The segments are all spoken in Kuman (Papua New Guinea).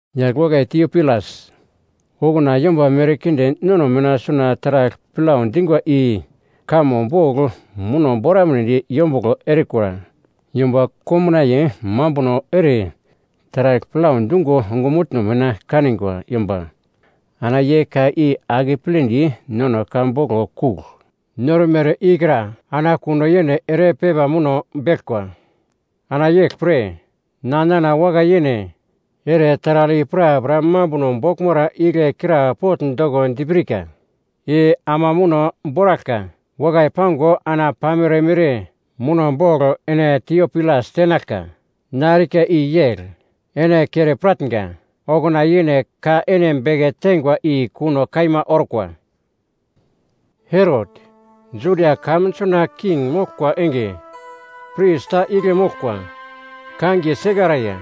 Yagl wakai Tiopilas, okuna yomba merkinde nono mina suna taragl plau dingwa i kamo boglo muno boramunedi yombuglo erikura. Yomba komnaiye mambuno ere taragl plau dungo ongumutno mina kanigwa yomba, ana ye ka i akepledi nono ka boglo kugl normere ikra, ana kuno yene ere pepa muno beglkwa. Ana yeglpre, na nana wakai yene ere taragl i prapra mambuno boglmara igle krapogl doko dipirka. I ama muno boraglka wakai pango ana pamere mere muno bogl ene Tiopilas tenaglka. Na erika i yegl, ene kere piratnga, okuna yene ka ene beke teingwa i kuno kaima orkwa. Herot, Judia kamun suna king moglkwa enge, pris ta igle moglkwa, kangiye Sekaraia.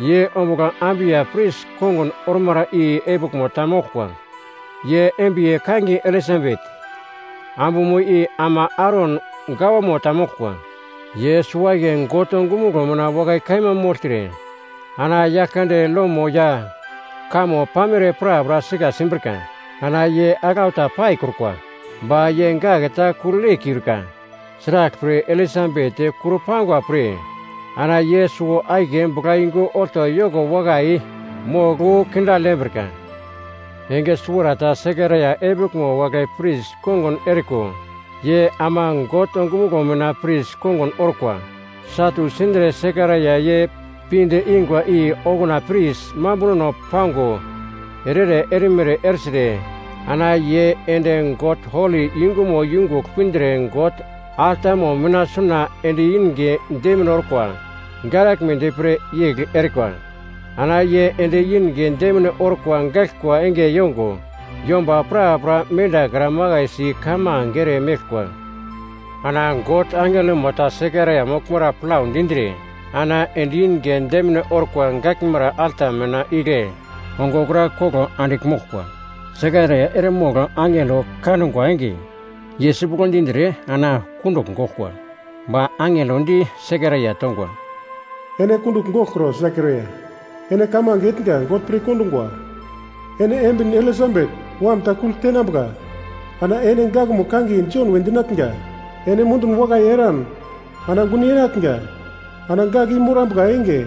Ye ombugl Abiya pris kongun ormara i epiglmo ta moglkwa. Ye embiye kangiye Elisabet, ambumo i ama Aron gawamo ta moglkwa. Ye suwo-akiye God ongumuglo mina wakai kaima mogltre ana Yaglkande lomo ya kamo pamere prapra sika simbrika. Ana ye aglau ta paikrukwa. Ba ye gak ta kugl yeikiurika, sraglpre Elisabet kurpangwa pre ana ye suwo-akiye buglayungu olto yoko wakai mogl wu kindagl yembrika. Enge suwarata Sekaraia epiglmo wagle pris kongun eriko, ye ama God ongumuglo mina pris kongun orkwa. Satu sindre Sekaraia ye pinde ingwa i okuna pris mambunono pango ere-ere erimere ertre ana ye ende God holi yungumo yungugl pindre God altamo mina suna endi inge demine orkwa garaglmedi pre yegl erikwa. Ana ye endi inge demine orkwa gaglkwa enge yongo, yomba prapra mendakra makaisi kamange ere meglkwa. Ana God angelomo ta Sekaraia moglmara plau dindre ana endi inge demine orkwa gaglmara alta mina igle, ongo wokra koglo andigl moglkwa. Sekaraia eremogl angelo kangwa enge, ye sipuglo dindre ana kundugl goglkwa. Ba angelo di Sekaraia tongwa, “Ene kundugl goglkro, Sekaraia, ene kamange etnga God pir kondungwa. Ene embin Elisabet wam ta kugl tenambuka ana ene gakmo kangiye Jon we dinatnga. Ene mundun wakai eran ana gun yenatnga, ana gak i morambuka enge,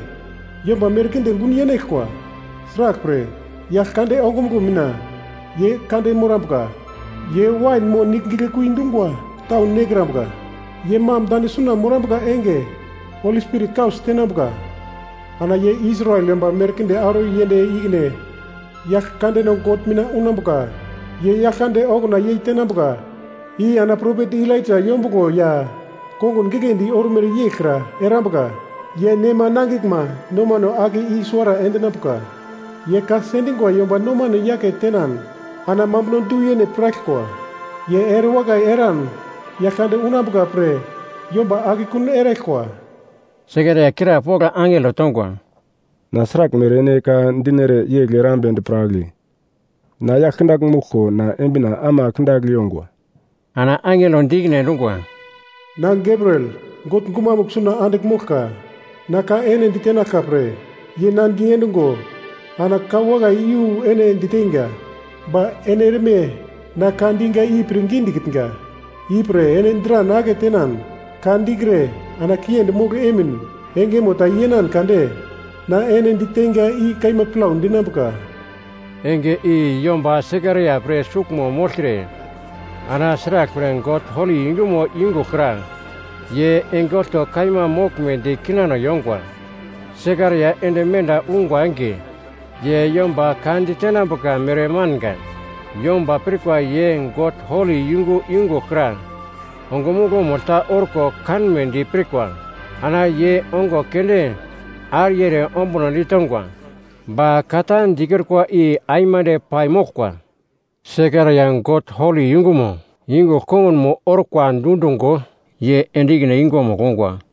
yomba merkinde gun yenaglkwa. Sraglpre, Yaglkande ongumuglo mina ye kande morambuka. Ye wain mo nigl giglekui dungwa tau nekrambuka. Ye mam dane suna morambuka enge Holi Spirit kausi tenambuka. Ana ye Israel yomba merkinde auro yend ikine Yaglkandeno God mina unambuka. Ye Yaglkande okuna yei tenambuka i ana propet Elaija yombuglo ya kongun giglendi ormere yeglkra erambuka. Ye nema nangiglma nomano ake i-suwara endinambuka. Ye ka sendingwa yomba nomano yake tenan ana mambuno du-yene piraglkwa. Ye erewakai eran, Yaglkande unambuka pre yomba akekun eraglkwa.” Sekaraia krapogl angelo tongwa, “Na sraglmere ene ka dinere yegl erambedi piragle? Na yagl kindagl moglko, ana embina ama kindagl yongwa.” Ana angelo di ikine endungwa, “Na Gabriel, God gumamugl suna andigl moglka, na ka ene ditenaglka pre, ye na diendungo ana ka wakai iyu ene diteinga. Ba ene erme na ka diga i pirngi dikitnga, ipre ene dran aketenan ka dikre, ana kiendi mogl emin, engemo ta yenan kade, na ene diteinga, i kaima plau dinambuka.” Enge i yomba Sekaraia pre suglmo mogltre, ana sraglpre God holi yungumo yungugl kra ye enge olto kaima moglmedi kinano yongwa. Sekaraia ende menda ungwa enge, ye yomba ka ditenambuka mere manga. Yomba pirkwa ye God holi yungu yungugl kra ongumuglo-mugl ta orko kanmedi pirkwa. Ana ye ongo keunde ariye ere ombuno ditongwa. Ba ka ta dikrukwa i aimande paimoglkwa. Sekaraia God holi yungumo yungugl kongunmo orkwa dundungo, ye ende ikine yungumugl ongwa.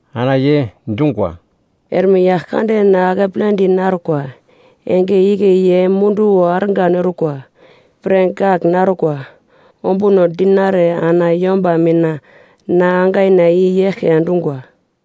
Ana ye dungwa, “Erme Yaglkande na akepledi narkwa. Enge igle ye munduwo argan orkwa pre gak narukwa ombuno dinare ana yomba mina na angaina i eglke endungwa.”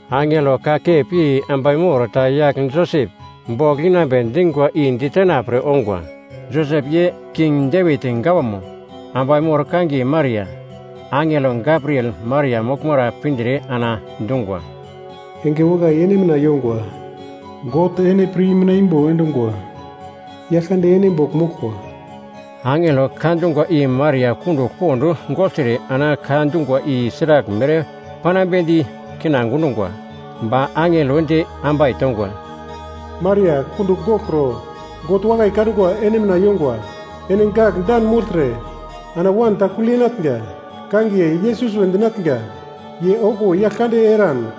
Angelo kakep yei ambai mor ta yagl Josep bogl inambe dingwa i ditena pre ongwa. Josep ye King Devit gawamo, ambai mor kangiye Maria. Angelo Gabriel Maria moglmara pindre ana dungwa, “Enge wakai ene mina yongwa! God ene pir i mitna imbo endungwa. Yaglkande ene bogl moglkwa.” Angelo ka dungwa i Maria kundugl pond gogltre ana ka dungwa i sraglmere panambedi kina gundungwa. Ba angelo di ambai tongwa, “Maria, kundugl goglkro, God wakai kangwa ene mina yongwa. Ene gak dan mogltre, ana wan ta kugl yenatnga, kangiye Yesus we dinatnga. Ye okuwo yagl kande eran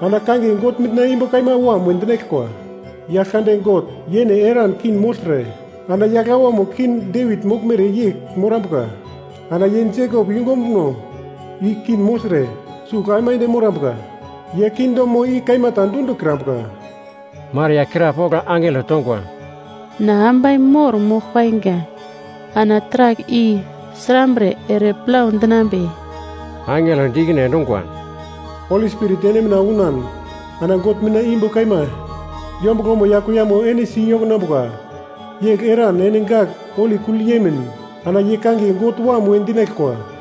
ana kangiye God Mitna Imbo Kaima Wam we dinaglkwa. Yaglkande God, yene eran king mogltre ana yagl awamo King Devit moglmere yegl morambuka. Ana ye Jekop yungumo ombuno i king mogltre sugl aimande morambuka. Ye kingdomo i kaima ta dundikrambuka.” Maria krapogl angelo tongwa, “Na ambai mor mogl painga, ana taragl i srambre ere plau dinambe?” Angelo di ikine endungwa, “Holi Spirit ene mina unan ana God Mitna Imbo Kaima yombuglomo ya kuiyamo ene si yokonambuka. Yegl eran ene gak holi kugl yemin, ana ye kangiye God Wam we dinaglkwa.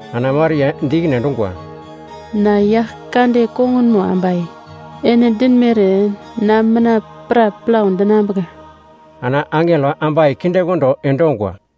Ana Maria di ikine endungwa, “Na Yaglkande kongunmo ambai, ene dinmere na mina pra plau dinambuka.” Ana angelo ambai kindekondo endongwa.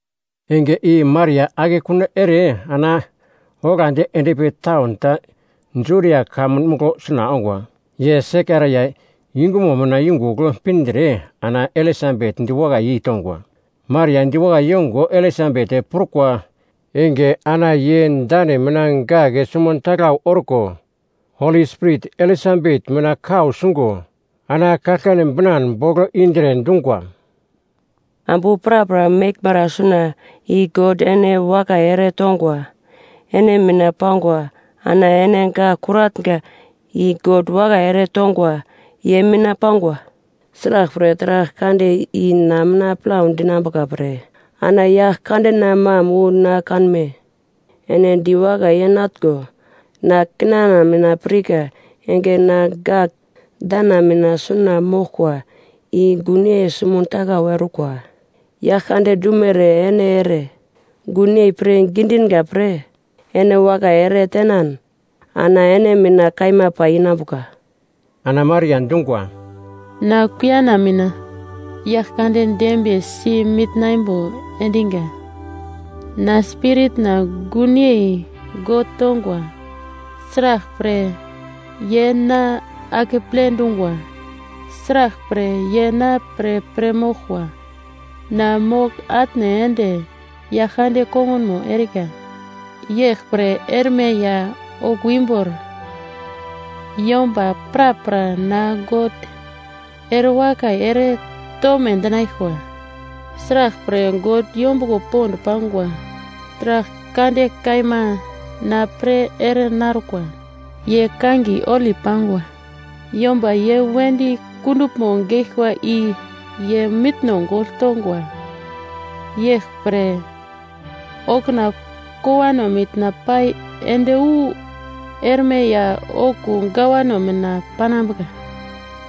Enge i Maria akekun ertre ana oglandi endpi taun ta Judia kamun muglo suna ongwa. Ye Sekaraia yungumo mina yungugl pindre ana Elisabet diwakai yeitongwa. Maria diwakai yongo Elisabet prukwa enge ana ye dane mina gak sumuntaglau orko, Holi Spirit Elisabet mina kau sungo, ana kaglkane binan bogl indre, dungwa, “Ambu prapra meglmara suna i God ene wakai ere tongwa ene mina pangwa ana ene gak kuratnga i God wakai ere tongwa ye mina pangwa! Sraglpre taragl kande i na mina plau dinambuka pre, ana Yaglkandena mam wu na kanme? Ene diwakai yeinatngo, na kinana mina pirka enge ana gak dana mina suna moglkwa i gunyei sumuntaglau orkwa. Yaglkande dumere ene ere gunyei pirngi dinga pre ene wakai ere tenan, ana ene mina kaima pai inambuka.” Ana Maria dungwa, “Na kuiyana mina Yaglkande dembiyesi mitna imbo endinga. Na spiritna gunyei God tongwa, sraglpre, ye na akeple dungwa. Sraglpre, ye na pre pir moglkwa, na mogl-atne ende Yaglkande kongunmo erika. Yeglpre erme ya okuwo imbor yomba prapra na God ere wakai ere tome dinaglkwa. Sraglpre, God yombuglo pond pangwa taragl kande kaima na pre ere narkwa, ye kangiye holi pangwa. Yomba ye wedi kunduglmo geglkwa i ye mitno gogl tongwa. Yeglpre, okuna kowano mina pai ende wu erme ya okuwo gawano mina panambuka.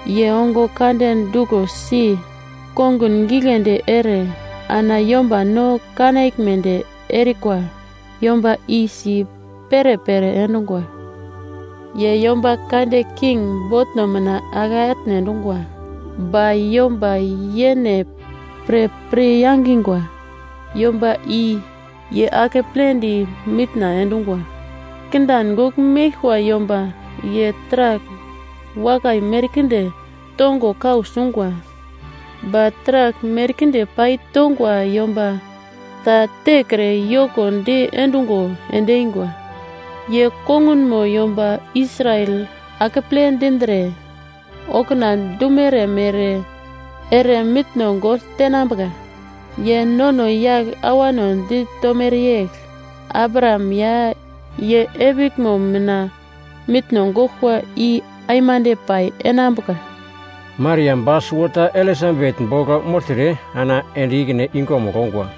Ye ongo kande duglosi kongun giglendi ere ana yomba no kanaglmedi erikwa yomba i si perepere endungwa. Ye yomba kande king botno mina ake atne endungwa, ba yomba yene pre pir yangingwa yomba i ye akepledi mitna endungwa. Kindan gogl meglkwa yomba ye taragl wakai merkinde tongo kau sungwa, ba taragl merkinde pai tongwa yomba ta tekre yoko diendungo endeingwa. Ye kongunmo yomba Israel akeple dindre, okuna dumere mere ere mitno gogl tenambuka. Ye nono yagl awano ditomere yegl: Abraham ya ye epiglmo mina mitno goglkwa i aimande pai enambuka.” Maria ba suwota Elisabet bogl mogltre ana ende ikine yungumugl ongwa.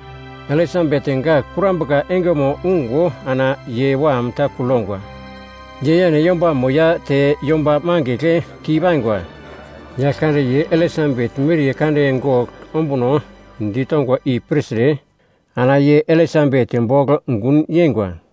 Elisabet gak kurambuka engemo ungo ana ye wam ta kugl yongwa. Ye yene yombamo ya te yomba mangigl keipaingwa, Yaglkande ye Elisabet miriye kande gogl ombuno ditongwa i pirtre, ana ye Elisabet bogl gun yeingwa.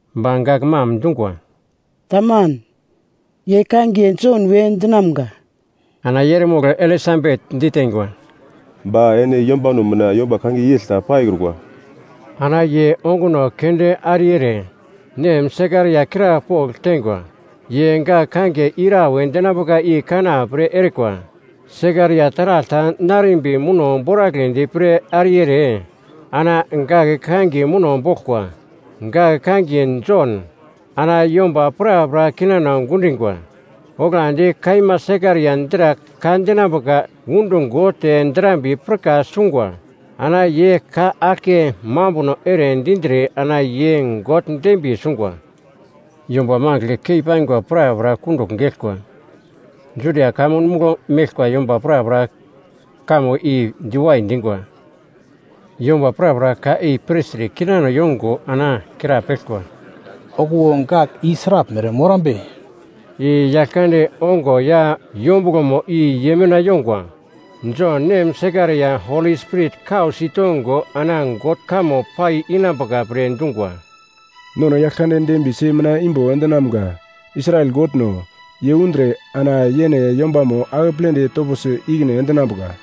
Ba gak mam dungwa, “Taman, ye kangiye Jon we dinamga.” Ana ye eremogl Elisabet diteingwa, “Ba ene yombano mina yomba kangiye yegl ta paikrukwa.” Ana ye onguno keunde ariye ere nem Sekaraia krapogl teingwa. Ye gak kangiye ira we dinambuka i kana pre erikwa. Sekaraia taragl ta narimbi muno boragledi pre ariye ere, ana gak kangiye muno boglkwa, “Gak kangiye Jon.” Ana yomba prapra kinano gundingwa. Oglandi kaima Sekaraia dra ka dinambuka undungo te drambiye pirka sungwa ana ye ka aglke mambuno ere dindre ana ye God dembiye sungwa. Yomba mangigl keipaingwa prapra kundugl geglkwa, Judia kamun muglo meglkwa yomba prapra kamo i diwai dingwa. Yomba prapra ka i pirtre kinano yongo ana krapeglkwa, “Okuwo gak i sraglmere morambe?” I Yaglkande ongo ya yombuglomo i ye mina yongwa. Jon nem Sekaraia Holi Spirit kau sitongo ana God kamo pai inambuka pre dungwa: “Nono Yaglkande dembiyesi mitna imbo endinamga. Israel Godno, ye undre ana yene yombamo akepledi toposi ikine endinambuka.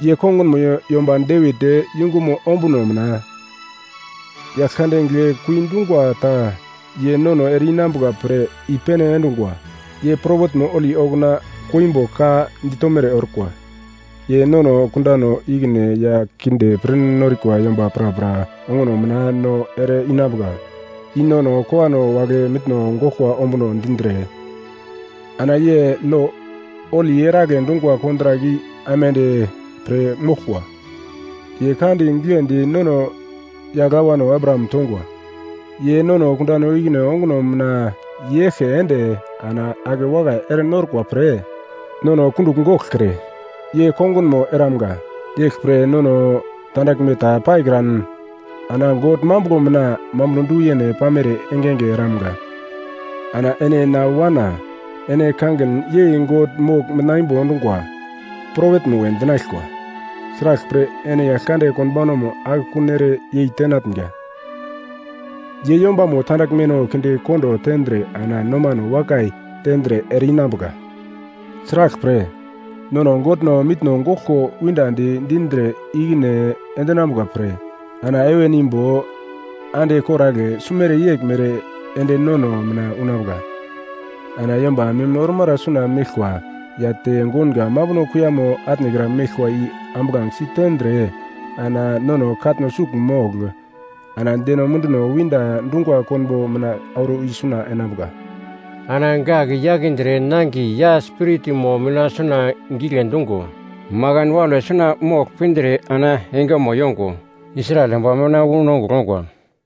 Ye kongunmo yomba Devit yungumo ombuno mina. Yaglkande giglekui dungwa ta, Ye nono ere-inambuka pre i-pene endungwa. Ye propetmo holi okuna koimbo ka ditomere orkwa. Ye nono kundano ikine ya kinde pir norikwa yomba prapra onguno mina nono ere-inambuka. I nono kowano wagle mitno goglkwa ombuno dindre. Ana ye lo holi eragle dungwa kontrak i aimande pir moglkwa. Ye ka di giglendi nono yagl awano Abraham tongwa. Ye nono kundano ikine onguno mina i-yeglke ende, ana ake wakai ere norkwa pre, nono kundugl goglkre, ye kongunmo eramunga. Yeglpre nono tandaglme ta paikran ana God mambuglo mina mambuno du-yene pamere engenge eramga. Ana ene na wana, ene kangin yei God Mogl Mitna Imbo endungwa, propetmo we dinaglkwa, sraglpre, ene Yaglkande konbaunamo akekun ere yeitenatnga. Ye yombamo tandaglmeno kindekondo tendre ana nomano wakai tendre ere-inambuka. Sraglpre, nono Godno mitno goglko windadi dindre ikine endinambuka pre, ana heven imbo ande koragle sumere yeglmere ende nono mina unambuka. Ana yomba mim ormara suna meglkwa, ya te gounga mambuno kuiyamo atnekra meglkwa i ambuglangesi tendre, ana nono katno sugl mogl. Ana deno munduno winda dungwa konbo mina auro i suna enambuka.” Ana gak yakindre nangiye ya spiritmo mina suna gigle dungo, makan waule suna mogl pindre ana engemo yongo, Israel yomba mina wu nongugl ongwa.